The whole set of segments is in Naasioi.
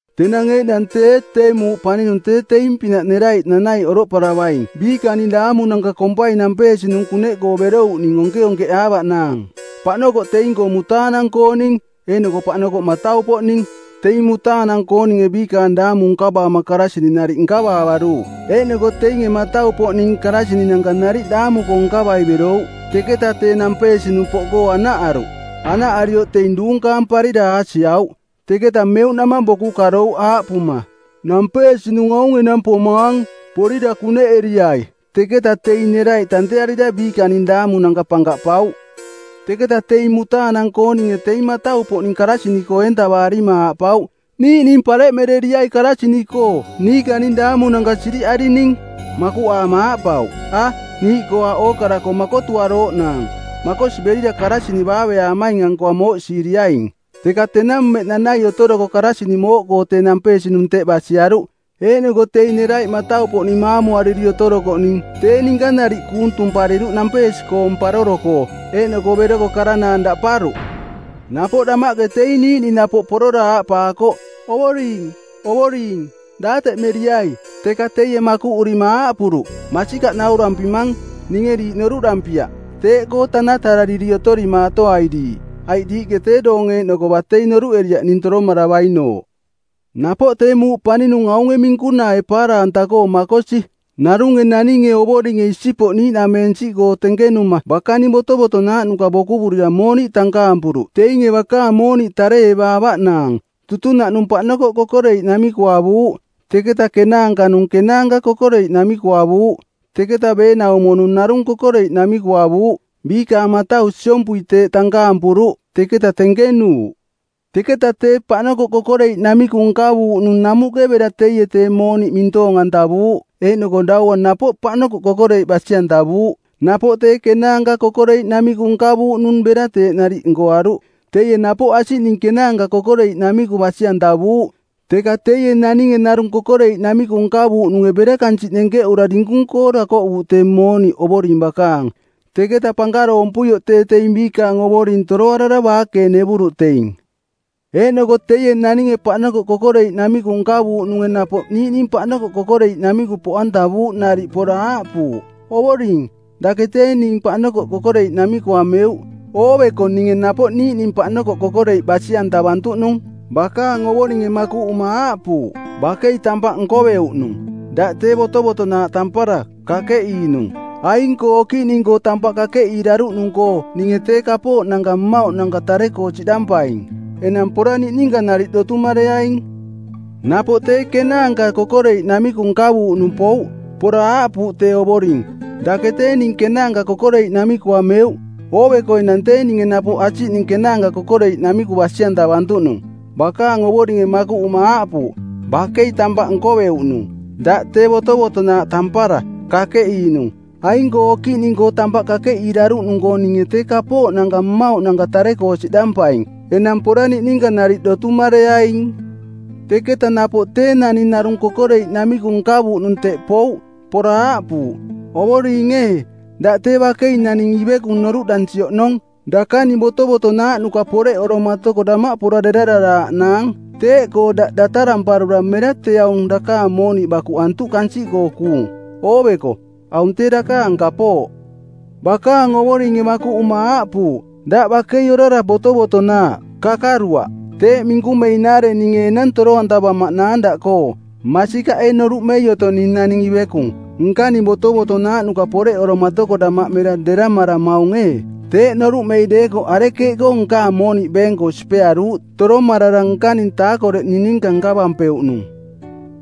“Tenang eeꞌnang tee tee muuꞌ paninung tee teing pinaꞌ neraiꞌ nanaiꞌ oroꞌparavaing biikaning daamunanka kompai nampeesinung kuneꞌkoo berouꞌning onkeonkeꞌaavaꞌnaang. Paꞌnokoꞌ teing-koo mutaanang-kooning eeꞌnoko paꞌnokoꞌ matau-poꞌning. Teinge mutaanang-kooninge biikaang daamu nkavaama karasini nariꞌ nkavaavaruuꞌ. Eeꞌnoko teinge matau-poꞌning karasininanka nariꞌ daamu-koo nkavai berouꞌ. Teka tee nampeesinung poꞌkoo anaꞌaruꞌ. Anaꞌarioꞌ teing duunkaamparira aasiauꞌ. Teketa meuꞌnamang boku karouꞌ aaꞌpuma, ‘Nampeesinung aung enang pomaang. Porira kuneꞌeriai.’ Teketa teing neraiꞌ tantearira biikaning daamunanka pankaꞌpauꞌ. Teketa teing mutaanang-kooninge teing matau-poꞌning karasini-koo eentavaarima aaꞌpauꞌ, ‘Niiꞌning pareꞌmereriai karasini-koo. Niikaning daamunanka siriꞌarining.’ Makuꞌaama aaꞌpauꞌ, ‘A, niiꞌkoo aaꞌ ookara-koo makotuarooꞌnaang. Makosi berira karasini baaveaamaing-ankoa mooꞌsiiriaing.’ Teka tenang mmeꞌ nanai otoroko karasini mooꞌkoo tee nampeesinung teꞌ basiaruꞌ. Eeꞌnoko teing neraiꞌ matau-poꞌning maamuariri otorokoꞌning tee ninka nariꞌ kuung tumpariruꞌ nampeesi-koong paroro-koo. Eeꞌnoko beroko karanaang daꞌparuꞌ. Napoꞌ damaꞌke teing niiꞌning napoꞌ porora aaꞌpaakoꞌ, ‘Ovoring, ovoring, daateꞌmeriai.’ Teka teie makuꞌurima aaꞌpuruꞌ, ‘Masikaꞌ naurampimang, ninge diiꞌ noruꞌdampiaꞌ.’ Teeꞌkoo tanatarariri otorimaatoai diiꞌ, aiꞌ diiꞌke tee doong eeꞌnoko batei noruꞌeriaꞌ ning toromaravainooꞌ.” “Napoꞌ tee muuꞌ paninung aunge minkunaae paara-anta-koo makosi. Narunge naninge ovoringe isipoꞌ niiꞌnameensiꞌkoo tenkenuma bakaning botovotonaaꞌnuka bokuvurira mooniꞌ tankaampuruꞌ teinge bakaang mooniꞌ tare-evaavaꞌnaang. Tutunaꞌnung paꞌnokoꞌ kokoreiꞌnamiku avuuꞌ. Teketa kenaanka-nung kenaanka kokoreiꞌnamiku avuuꞌ. Teketa beenaumo-nung narung kokoreiꞌnamiku avuuꞌ. Biikaang matau siompui teeꞌ tankaampuruꞌ. Teketa tenkenuuꞌ. Teketa tee paꞌnokoꞌ kokoreiꞌnamiku nkavuuꞌnung namuꞌke bera teie tee mooniꞌ mintoong-antavuuꞌ eeꞌnoko daua napoꞌ paꞌnokoꞌ kokoreiꞌ basi-antavuuꞌ. Napoꞌ tee kenaanka kokoreiꞌnamiku nkavuuꞌnung bera teeꞌ nariꞌ nkoaruꞌ. Teie napoꞌ asiꞌning kenaanka kokoreiꞌnamiku basi-antavuuꞌ. Teka teie naninge narung kokoreiꞌnamiku nkavuuꞌnunge bera kansiꞌ nenkeꞌura dinkung-koo dakoꞌuuꞌ tee mooniꞌ ovoring bakaang. Teketa pankaroompuioꞌ tee teing biikaang ovoring toroarara baakeenevuruꞌ teing. Eeꞌnoko teie naninge paꞌnokoꞌ kokoreiꞌnamiku nkavuuꞌnunge napoꞌ niiꞌning paꞌnokoꞌ kokoreiꞌnamiku poꞌantavuuꞌ nariꞌ pora aaꞌpuuꞌ, ‘Ovoring, dake tee ning paꞌnokoꞌ kokoreiꞌnamiku ameuꞌ. Ooveko ninge napoꞌ niiꞌning paꞌnokoꞌ kokoreiꞌ basi-antavantuꞌnung.’ Bakaang ovoringe makuꞌuma aaꞌpuuꞌ, ‘Bakei tampaꞌ nkoveuꞌnung, daꞌ tee botovotonaaꞌ tampara, kakeꞌiinung. Aing-koo okiꞌning-koo tampaꞌ kakeꞌiiraruꞌnung-koo ninge tee kapooꞌnanka mmauꞌnanka tare-koo siꞌdampaing. Enang pora niꞌninka nariꞌ dotumareaing.’ Napoꞌ tee kenaanka kokoreiꞌnamiku nkavuuꞌnung pouꞌ. Pora aaꞌpuuꞌ tee ovoring, ‘Dake tee ning kenaanka kokoreiꞌnamiku ameuꞌ. Ooveko enang tee ninge napoꞌ asiꞌning kenaanka kokoreiꞌnamiku basi-antavantuꞌnung.’ Bakaang ovoringe makuꞌuma aaꞌpuuꞌ, ‘Bakei tampaꞌ nkoveuꞌnung, daꞌ tee botovotonaaꞌ tampara, kakeꞌiinung. Aing-koo okiꞌning-koo tampaꞌ kakeꞌiiraruꞌnung-koo ninge tee kapooꞌnanka mmauꞌnanka tare-koo siꞌdampaing. Enang pora niꞌninka nariꞌ dotumareaing.’ Teketa napoꞌ tee naning narung kokoreiꞌnamiku nkavuuꞌnung teꞌ pouꞌ. Pora aaꞌpuuꞌ, ‘Ovoring ee, daꞌ tee bakei naning ivekung noruꞌdansi oꞌnong. Dakaning botovotonaaꞌnuka poreꞌoromatoko damaꞌ pora derararaaꞌnaang. Teeꞌkoo daꞌ dataramparura mera tee aung dakaang mooniꞌ bakuꞌantuꞌ kansiꞌkoo kuung. Ooveko, aung tee dakaang kapooꞌ.’ Bakaang ovoringe makuꞌuma aaꞌpuuꞌ, ‘Daꞌ bakei orara botovotonaaꞌ, kakaruaꞌ. Teeꞌ minkumeinaare ninge enang toro-antavamaꞌnaang daꞌkoo. Masikaꞌ ee noruꞌmei otong ning naning ivekung? Nkaning botovotonaaꞌnuka poreꞌoromatoko damaꞌ mera deramaramaung ee? Teeꞌ noruꞌmei deekoꞌ arekeeꞌkoo nkaang mooniꞌ beeng-koo sipearuuꞌ, toromarara nkaning taakoreꞌning ninka nkavampeuꞌnung?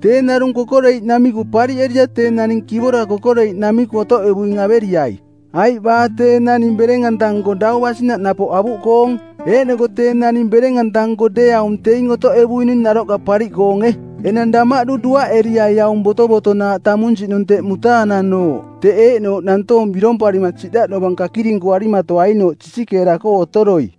Tee narung kokoreiꞌnamiku pariꞌerira tee naning kivora kokoreiꞌnamiku otoꞌevuing averiai. Aiꞌ baa tee naning bereng-anta-nko dau basinaꞌ napoꞌ avuꞌkoong. Eeꞌnoko tee naning bereng-anta-nko deeaung teing otoꞌevuining naroꞌka pariꞌkoonge. Enang damaꞌdu duaꞌeriai aung botovotonaaꞌ tamunsiꞌnung teꞌ mutaananooꞌ, teꞌ eeꞌnooꞌ nantoong biromparima siꞌdaꞌ dovang kakirinkuarimatoainooꞌ sisikeera-koo otoroi.’”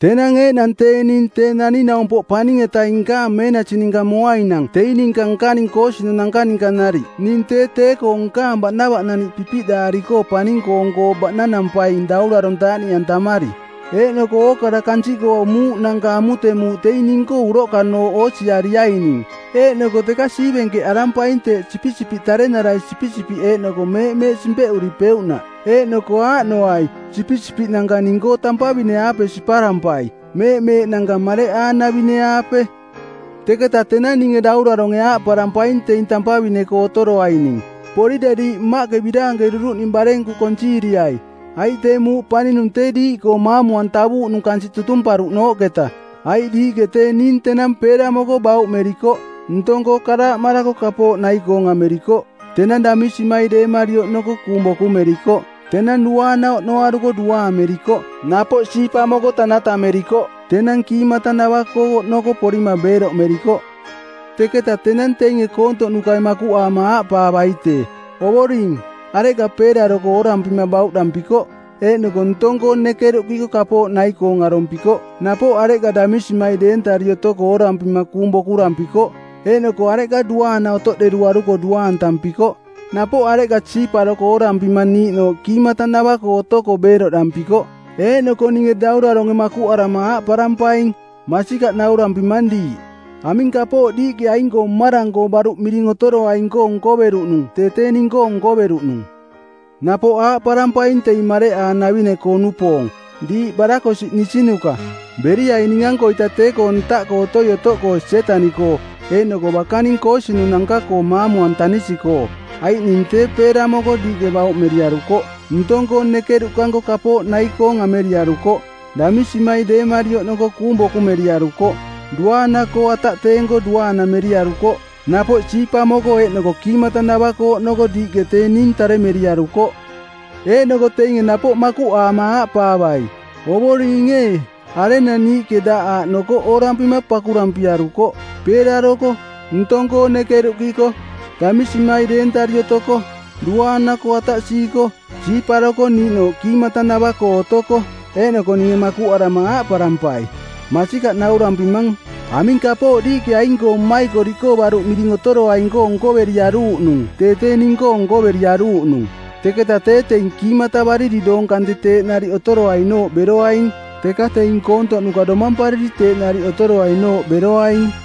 “Tenang eeꞌnang tee ning Tee Naning-naumpoꞌ Paning-etaing nkaang meenasi ninka moainang teing ninka nkaning koosinunanka ninka nariꞌ ning tee tee-koo nkaang baꞌnavaꞌnaniꞌ pipiꞌdaari-koo paning-koong-koo baꞌnanampaing daurarong taaꞌniꞌantamari. Eeꞌnoko ookara kansiꞌkoo muuꞌnanka amutemuuꞌ teing ning-koo uroꞌkanooꞌ oosiariaining eeꞌnoko teka siivenkeꞌarampaing teeꞌ sipisipiꞌ tarenarai sipisipiꞌ eeꞌnoko meeꞌmeeꞌ simpeꞌuripeuꞌnaꞌ. Eeꞌnoko aaꞌnoai, sipisipiꞌnanka ning-koo tampavine-aape siparampai, meeꞌmeeꞌnanka mareꞌaanavine-aape. Teketa tenang ninge dauraronge aaꞌparampaing teing tampavine-koo otoroaining, ‘Porira diiꞌ Mmaꞌke biraankeruruꞌning barenku konsiiriai, aiꞌ tee muuꞌ paninung tee diiꞌkoo maamu-antavuuꞌnung kansiꞌ tutumparuꞌnooꞌketa. Aiꞌ diiꞌke tee ning tenang peeramoko bauꞌmerikoꞌ. Ntong-koo karaaꞌmarako kapooꞌ nai-koong amerikoꞌ. Tenang damisimai deemari oꞌnoko kuung bokumerikoꞌ. Tenang duaana oꞌnoaruko duaamerikoꞌ. Napoꞌ siipamoko tanatamerikoꞌ. Tenang kiimatanava-koo oꞌnoko porima beeroꞌmerikoꞌ.’ “Teketa tenang teinge koontoꞌnukai makuꞌaama aaꞌpaavai tee, ‘Ovoring, areꞌka peeraroko oorampima bauꞌdampikoꞌ, eeꞌnoko ntong-koo nekeruꞌkiko kapooꞌ nai-koong arompikoꞌ? Napoꞌ areꞌka damisimai deentari otoko oorampima kuung bokurampikoꞌ, eeꞌnoko areꞌka duaana otoꞌderuaruko duaantampikoꞌ? Napoꞌ areꞌka siiparoko oorampima niiꞌnooꞌ kiimatanava-koo otoko beeroꞌdampikoꞌ?’ Eeꞌnoko ninge dauraronge makuꞌarama aaꞌparampaing, ‘Masikaꞌ naurampimang diiꞌ, aming kapooꞌ diiꞌke aing-koo mmarang-koo baruꞌ miring otoroaing-koo nkoveruꞌnung tee tee ning-koo nkoveruꞌnung.’ “Napoꞌ aaꞌparampaing teing mareꞌaanavine-koo-nupoong, ‘Diiꞌ barakosiꞌnisinuka, beriai ning-ankoita tee-koo ntaꞌkoo otoi otoꞌkoo Sietaniꞌkoo eeꞌnoko bakaning koosinunanka-koo maamu-antanisi-koo. Aiꞌ ning tee peeramoko diiꞌke bauꞌmeriarukoꞌ. Ntong-koo nekeruꞌkanko kapooꞌ nai-koong ameriarukoꞌ. Damisimai deemari oꞌnoko kuung bokumeriarukoꞌ. Duaana-koo ataꞌteenko duaanameriarukoꞌ. Napoꞌ siipamoko eeꞌnoko kiimatanava-koo oꞌnoko diiꞌke tee ning taremeriarukoꞌ.’ Eeꞌnoko teinge napoꞌ makuꞌaama aaꞌpaavai, ‘Ovoring ee, arenang niiꞌke daꞌ aaꞌnoko oorampima pakurampiarukoꞌ, peeraroko, ntong-koo nekeruꞌkiko, damisimai deentari otoko, duaana-koo ataꞌsiiko, siiparoko niiꞌnooꞌ kiimatanava-koo otoko?’ Eeꞌnoko ninge makuꞌarama aaꞌparampai, ‘Masikaꞌ naurampimang, aming kapooꞌ diiꞌke aing-koo mmaikoriꞌkoo baruꞌ miring otoroaing-koo nkoveriaruuꞌnung tee tee ning-koo nkoveriaruuꞌnung.’ Teketa tee teing kiimatavariri doong kante teeꞌ nariꞌ otoroainooꞌ beroaing, teka teing koontoꞌnuka domampariri teeꞌ nariꞌ otoroainooꞌ beroaing.”